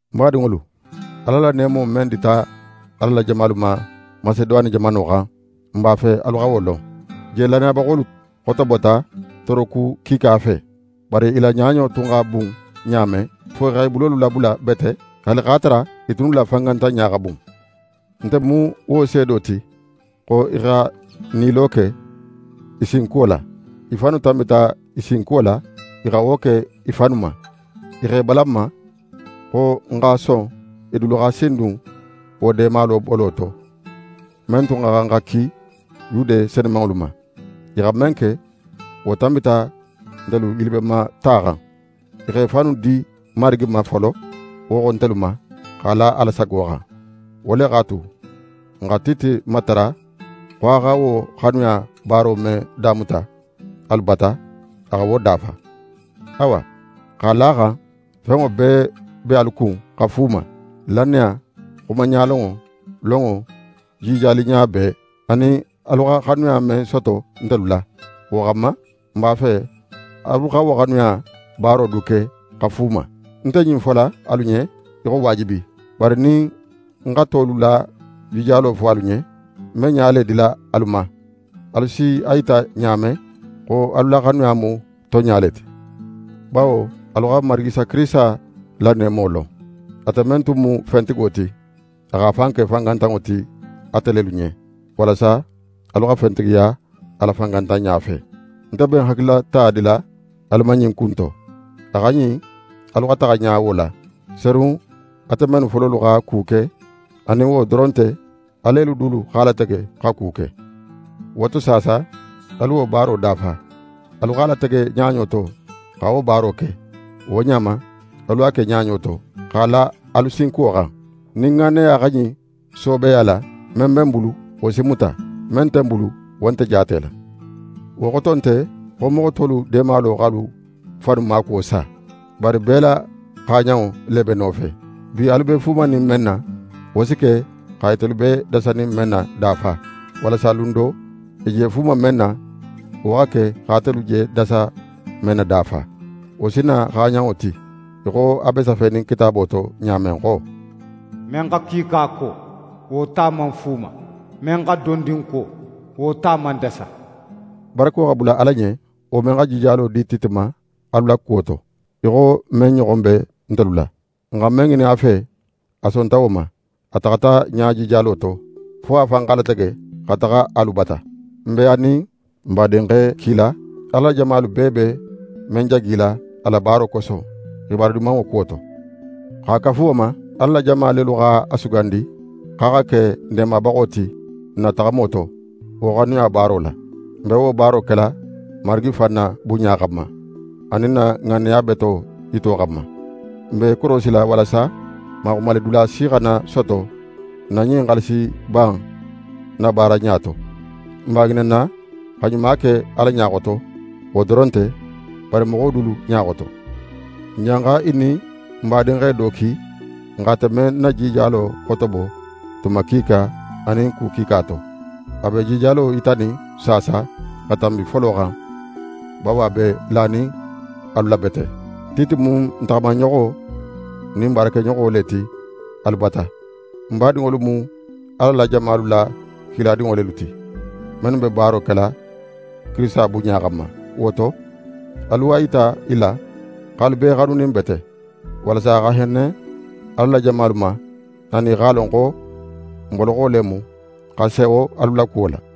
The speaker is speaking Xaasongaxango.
Ń badinŋolu, Ala la neemo men dita Ala la jamalu ma Maseduwane jamano xan, n b'a fe alu xa wo lon. Je lannayabaxolu xotobota tooroku kiika fe; bari i la ɲaɲo tun xa bun ɲa men, fo i xa i bulolu labula bete, haali x'a tara i tunnu la fangantanɲa xa bun. Nte mu wo seedo ti xo i xa nilo ke i sinkuwo la. I fannu tanbita i sinkuwo la, i xa wo ke i fannu ma. I x'e balan n ma xo n xa son i dulu xa sindun wo deema bolo to, men tun xa xan xa ki Yude senumanŋolu ma. I xa men ke, wo tanbita ntelu yilibenmata xan. I xa i fannu di Marigi ma folo, wo xo, ntelu ma, x'a la Ala sago xan. Wo le x'a tu, n xa Tite matara xo a xa wo xanuya baaro men damuta alu bata, a xa wo dafa. Awa, x'a la a xan fenŋo bee be alu kun xa fuuma: Lannaya, xuma ɲalonŋo, lonŋo, jijaliɲa bee, anin alu xa xanuya men soto ntelu la. Wo xanma, n b'a fe alu xa wo xanuya baaro du ke xa fuuma. Ń nte ɲin fola alu ɲen í xo waajibi, bari nin ń xa tolu la jijalo fo alu ɲen, ń be ɲa le dila alu ma alu si a yita ɲa men xo alu la xanuya mu tonɲa le ti. Bawo alu xa n Marigi Isa Kirisita la neemo lon: Ate men tun mu fentigo ti, a x'a fan ke fangantanŋo ti atelu ɲen, walasa alu xa fentigiya a la fangantanɲa fe. Nte be ń hakililata dila alu ma ɲin ku in to: A xa ɲin alu xa taxa ɲa wo la, serun ate mennu fololu xa ku ke anin wo doron nte, alelu dulu x'a latege xa ku ke. Wo to saasa, alu wo baaro dafa. Alu x'a latege ɲaɲo to xa wo baaro ke, wo ɲa ma, alu a ke ɲaɲo to, x'a la alu sinkuwo xan. Nin ŋanneya xa ɲin soobeya la, men be n bulu, wo si muta. Men nte bulu, wo nte jaatela. Wo xoto nte xo moxo tolu deemalo x'alu fannu maakuwo sa, bari bee la xaaɲanŋo le be nofe. Bi, alu be fuumanin men na, wo si ke xa itelu be dasanin men na dafa, walasa lun do, i je fuuma men na, wo xa ke xa atelu je dasa men na dafa. Wo si na xaaɲanŋo ti, í xo a be safenin Kitaabo to ɲa men xo: «Men xa kiika ko, wo ta man fuuma, men xa dondin ko, wo ta man dasa.» Barako xa bula Ala ɲen, wo men xa jijalo di Tite ma alu la kuwo to, í xo men ɲoxon be ntelu la. N xa men ŋinin a fe, a sonta wo ma. A taxata ɲa jijalo to, fo a fan x'a latege xa taxa alu bata. N be a nin n badinxe kila, Ala la jamalu bee be men jagila a la baaro koso, xibaru Dimanŋo kuwo to. X'a kafu wo ma, Ala la jama lelu x'a sugandi x'a xa ke n dandanbaxo ti n na taxamo to, wo xanuya baaro la. N be wo baaro kela Marigi fan na bunɲa xanma, anin n na ŋanneya beto yito xanma. N be i korosila walasa maxumalidula si xana soto n ma ɲin xaalisiba in nabaaraɲa to. N b'a ŋininna xa ɲuma ke Ala ɲa xoto, wo doron nte, bari moxo dulu ɲa xoto. N janxa i nin n badinxe do ki, n x'ate men na jijalo xotobo tuma kiika anin ku kiika to. A be jijalo yitanin saasa xa tanbi folo xan, bawo a be lanin alu la bete. Tite mu ń taxamaɲoxo nin ń baarakeɲoxo le ti alu bata. N badinŋolu mu Ala la jamalu la kiladinŋo lelu ti, mennu be baaro kela Kirisita bunɲa xanma. Wo to, alu a yita i la xo alu b'e xanunin bete, walasa a xa henne Ala la jamalu ma, anin i x'a lon xo n boloxo le mu xa sewo alu la kuwo la.